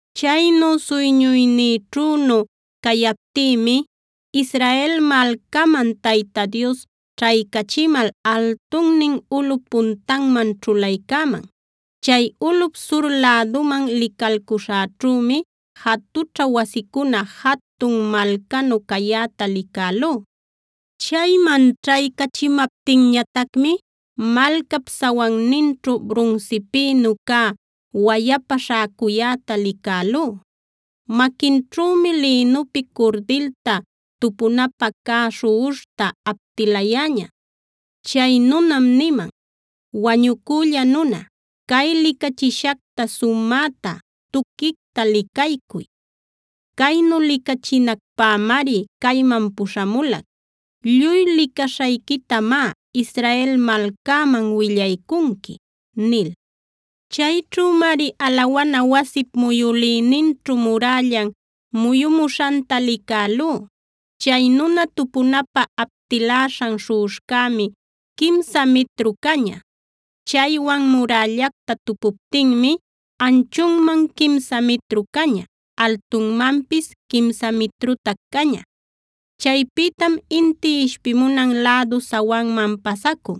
Chaynu suyñuynïćhünu cayaptïmi Israel malcaman Tayta Dios ćhaycachimal altunnin ulꞌup puntanman ćhulaycäman. Chay ulꞌup sur lädunman licalcuśhäćhümi jatućha wasicuna jatun malcanu cayäta licälú. Chayman ćhaycachimaptinñatacmi malcap sawanninćhu brunsipïnu cä wayapa śhäcuyäta licälú. Maquinćhümi lïnupi curdilta, tupunapä cä śhuꞌuśhta aptilayäña. Chay nunam niman: “Wañucülla nuna, cay licachishacta sumäta, tuquicta licaycuy. Caynu licachinacpämari cayman puśhamulac. Lluy licaśhayquitamá Israel malcäman willaycunqui” nil. Chayćhümari alawana wasip muyülïninćhu murällan muyumuśhanta licälú. Chay nuna tupunapä aptiläśhan śhuꞌuśhcämi quimsa mitru caña. Chaywan murällacta tupuptinmi anchunman quimsa mitru caña; altunmanpis quimsa mitrutac caña. Chaypïtam inti ishpimunan lädu sawanman pasacun.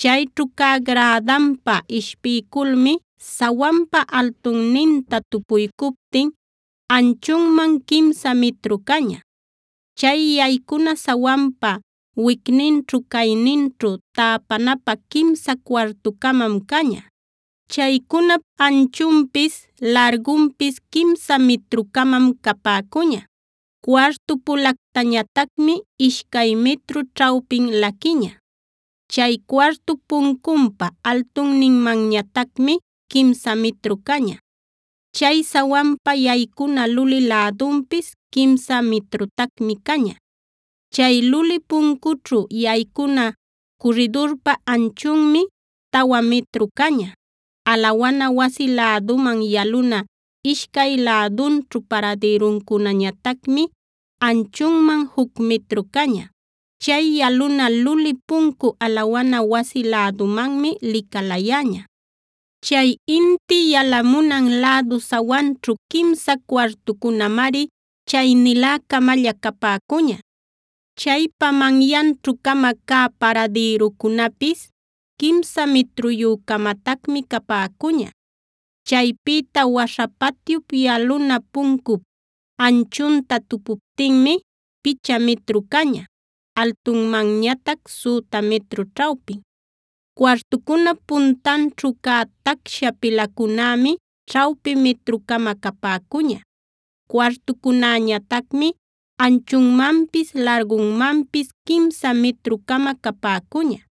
Chayćhu cä grädanpa ishpiyculmi sawanpa altunninta tupuycuptin anchunman quimsa mitru caña. Chay yaycuna sawanpa wicninćhu-cayninćhu täpanapä quimsa cuartu-camam caña. Chaycunap anchunpis, largunpis quimsa mitru-camam capäcuña. Cuartu-pulactañatacmi ishcay mitru ćhawpin laquiña. Chay cuartup puncunpa altunninmanñatacmi quimsa mitru caña. Chay sawanpa yaycuna luli lädunpis quimsa mitrutacmi caña. Chay luli puncućhu yaycuna curridurpa anchunmi tawa mitru caña. Alawana wasi läduman yaluna ishcay lädunćhu paradïruncunañatacmi anchunman juc mitru caña. Chay yaluna luli puncu alawana wasi lädumanmi licalayäña. Chay inti yalamunan lädu sawanćhu quimsa cuartucunamari chaynilä-camalla capäcuña. Chaypa manyanćhu-cama cä paradïrucunapis quimsa mitruyü-camatacmi capäcuña. Chaypïta waśha patyup yaluna puncup anchunta tupuptinmi picha mitru caña, altunmanñatac süta mitru ćhawpin. Cuartucunap puntanćhu cä tacsha pilacunämi ćhawpi mitru-cama capäcuña. Cuartucunäñatacmi anchunmanpis, largunmanpis quimsa mitru-cama capäcuña.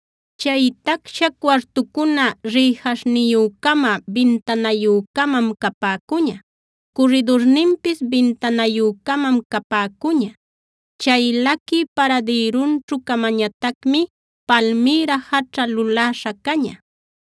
Chay tacsha cuartucuna rïjaśhniyu-cama, bintanayü-camam capäcuña. Curridurninpis bintanayü-camam capäcuña. Chay laquï paradïrunćhu-camañatacmi palmïra jaćha luläśha caña.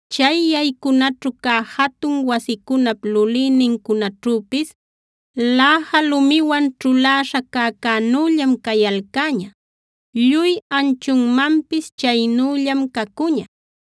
Chay yaycunaćhu cä jatun wasicunap lulïnincunaćhüpis läja lumiwan ćhuläśha cäcänüllam cayalcäña. Lluy anchunmanpis chaynüllam cacuña.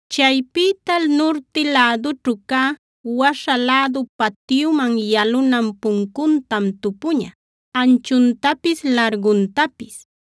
Chaypïta nurti lädućhu cä, waśha lädu patyuman yalunan puncuntam tupuña, anchuntapis larguntapis.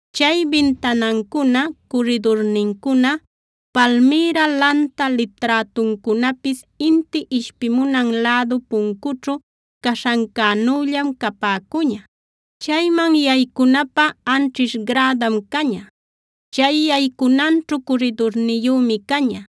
Chay bintanancuna, curridurnincuna, palmïra lanta liträtuncunapis inti ishpimunan lädu puncućhu caśhancänüllam capäcuña. Chayman yaycunapä anćhish grädam caña. Chay yaycunanćhu curridurniyümi caña.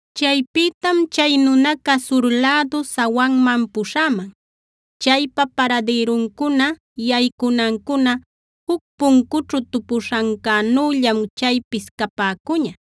Chaypïtam chay nunaca sur lädu sawanman puśhäman. Chaypa paradïruncuna, yaycunancuna juc puncućhu tupuśhancänüllam chaypis capäcuña.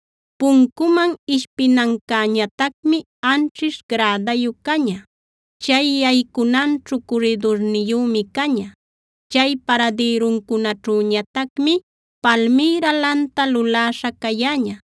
Puncuman ishpinancäñatacmi anćhish grädayu caña; chay yaycunanćhu curridurniyümi caña. Chay paradïruncunaćhüñatacmi palmïra lanta luläśha cayäña.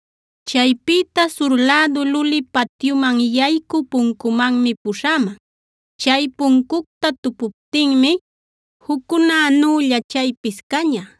Chaypïta sur lädu luli patyuman yaycü puncumanmi puśhäman. Chay puncucta tupuptinmi juccunänülla chaypis caña.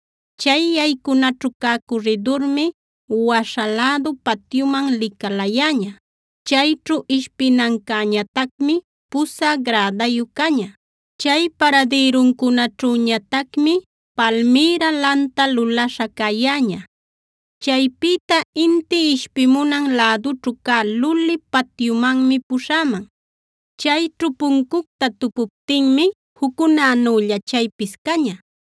Chay yaycunaćhu cä curridurmi waśha lädu patyuman licalayäña; chayćhu ishpinancäñatacmi pusä grädayu caña. Chay paradïruncunaćhüñatacmi palmïra lanta luläśha cayäña. Chaypïta inti ishpimunan lädućhu cä luli patyumanmi puśhäman. Chayćhu puncucta tupuptinmi juccunänülla chaypis caña.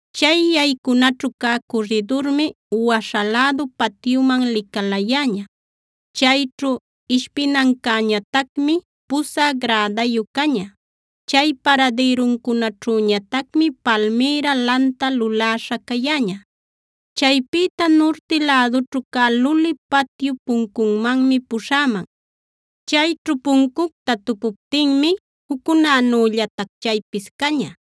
Chay yaycunaćhu cä curridurmi waśha lädu patyuman licalayäña; chayćhu ishpinancäñatacmi pusä grädayu caña. Chay paradïruncunaćhüñatacmi palmïra lanta luläśha cayäña. Chaypïta nurti lädućhu cä luli patyup puncunmanmi puśhäman. Chayćhu puncucta tupuptinmi juccunänüllatac chaypis caña.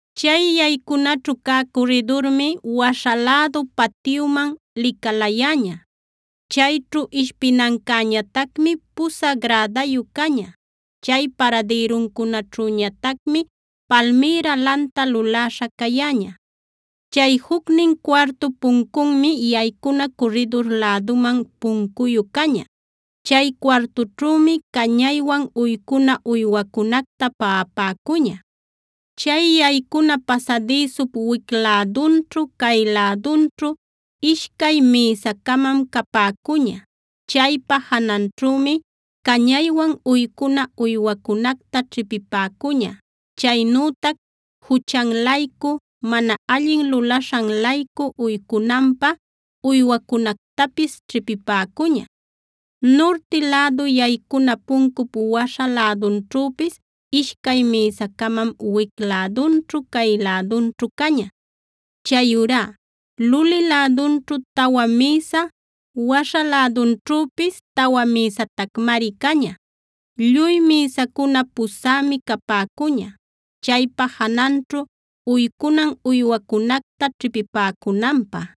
Chay yaycunaćhu cä curridurmi waśha lädu patyuman licalayäña; chayćhu ishpinancäñatacmi pusä grädayu caña. Chay paradïruncunaćhüñatacmi palmïra lanta luläśha cayäña. Chay jucnin cuartup puncunmi yaycuna curridur läduman puncuyu caña. Chay cuartućhümi cañaywan uycuna uywacunacta paꞌapäcuña. Chay yaycuna pasadïsup wic lädunćhu, cay lädunćhu ishcay mïsa-camam capäcuña. Chaypa jananćhümi cañaywan uycuna uywacunacta ćhipipäcuña; chaynütac juchan-laycu, mana allin lulaśhan-laycu uycunanpä uywacunactapis ćhipipäcuña. Nurti lädu yaycuna puncup waśha lädunćhüpis ishcay mïsa-camam wic lädunćhu cay lädunćhu caña. Chayurá luli lädunćhu tawa mïsa, waśha lädunćhüpis tawa mïsatacmari caña. Lluy mïsacuna pusämi capäcuña, chaypa jananćhu uycunan uywacunacta ćhipipäcunanpä.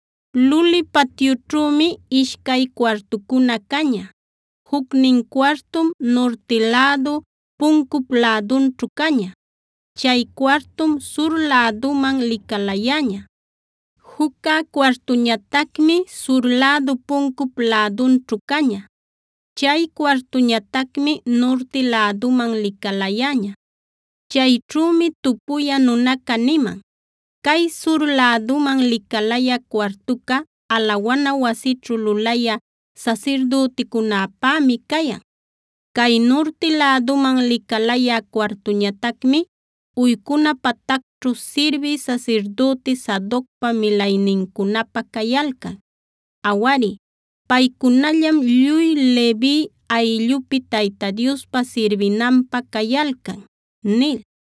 Luli patyućhümi ishcay cuartucuna caña. Jucnin cuartum nurti lädu puncup lädunćhu caña. Chay cuartum sur läduman licalayäña. Juccä cuartuñatacmi sur lädu puncup lädunćhu caña. Chay cuartuñatacmi nurti läduman licalayäña. Chayćhümi tupuyä nunaca niman: “Cay sur läduman licalayä cuartuca alawana wasićhu lulayä sasirdüticunäpämi cayan. Cay nurti läduman licalayä cuartuñatacmi uycuna patacćhu sirbï sasirdüti Sadocpa milaynincunäpä cayalcan. Awari, paycunallam lluy Levi ayllupi Tayta Diosta sirbinanpä cayalcan” nil.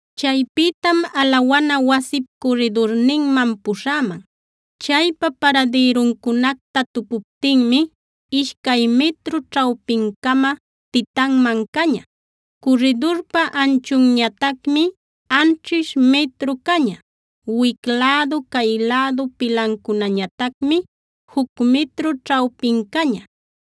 Chaypïtam alawana wasip curridurninman puśhäman. Chaypa paradïruncunacta tupuptinmi ishcay mitru ćhawpin-cama titanman caña. Curridurpa anchunñatacmi anćhish mitru caña; wic lädu, cay lädu pilancunañatacmi juc mitru ćhawpin caña.